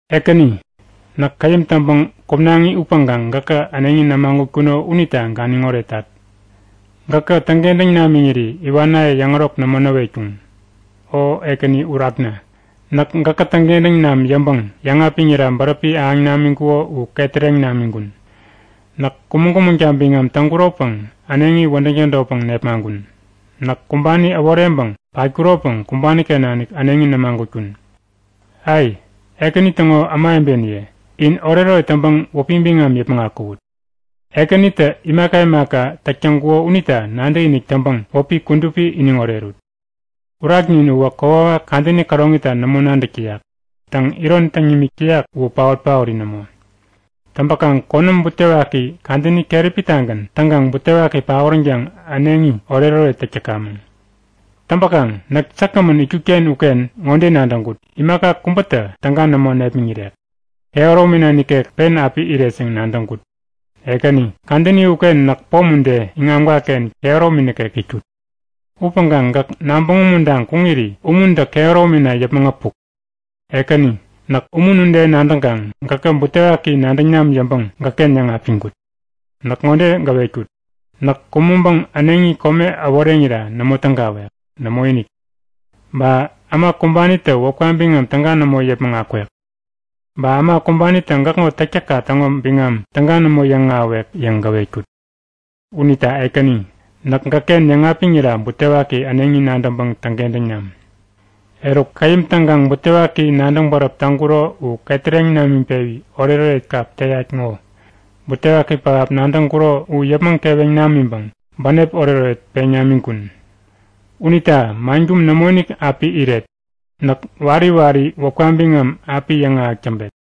Ekäni, näk käyäm täŋpäŋ kumnaŋi upäŋkaŋ gäkä äneŋi nämagutkuno unita ganiŋ oretat! Gäkä täŋkentäŋ namiŋiri iwanaye yäŋärok nämo näwetkuŋ. O Ekäni Urakna, näk gäkä täŋkentäŋ nam yäŋpäŋ yäŋapiŋira bäräpi ahäŋ namiŋkuko u ketäreŋ namiŋkun. Näk kumäŋ-kumäŋta biŋam täŋkuropäŋ äneŋi wädäŋ tädotpäŋ nepmaŋkun. Näk kumbani äworeŋpäŋ patkuropäŋ kumbaniken nanik äneŋi nämagutkun. Ai! Ekäni täŋo ämawebeniye, in oretoret täŋpäŋ wäpi biŋam yäpmäŋ akuwut! Ekänitä imaka imaka täk täŋkuko unita nadäkinik täŋpäŋ wäpi kudupi iniŋ orerut! Uraknin uwä kokwawak kadäni käroŋita nämo nadäk täyak. Täŋ, iron täŋ nimik täyak uwä paot-paori nämo. Täŋpäkaŋ konäm butewaki kadäni keräpitagän täŋkaŋ butewaki paoränkaŋ äneŋi oretoret täk täkamäŋ. Täŋpäkaŋ näk säkgämän itkutken uken ŋode nadäŋkut; Imaka kubätä täga nämo nepmäŋirek. Kehäromina nikek pen api iret yäŋ nadäŋkut. Ekäni, kadäni uken näk pom ude, iŋamkaken kehäromi nikek itkut. Upäŋkaŋ gäk nabäŋ umuntaŋ kuŋiri umuntä kehäromina yäpmäŋ äpuk. Ekäni, näk umun ude nadäŋkaŋ, gäkä butewaki nadäŋ nam yäŋpäŋ, gäkken yäŋapiŋkut. Näk ŋode gäwetkut; Näk kumäŋpäŋ äneŋi kome äworeŋira nämo tägawek. Nämoinik! Ba äma kumbanitä wäpka biŋam täga nämo yäpmäŋ akwek. Ba äma kumbanitä gäkŋo täktäkka täŋo biŋam täga nämo yäŋahäwek yäŋ gäwetkut. Unita Ekäni, näk gäkken yäŋapiŋira butewaki äneŋi nadäŋpäŋ täŋkentäŋ nam! Eruk, käyäm täŋkaŋ butewaki nadäŋ bäräp täŋkuro u ketäreŋ namiŋpewi oretoret kap teyat ŋo! Butewaki pähap nadäŋkuro u yäpmäŋ keweŋ namiŋpäŋ bänep oretoret peŋ namiŋkun. Unita mankum nämoinik api iret. Näk wari wari wäpka biŋam api yäŋahäk täŋpet!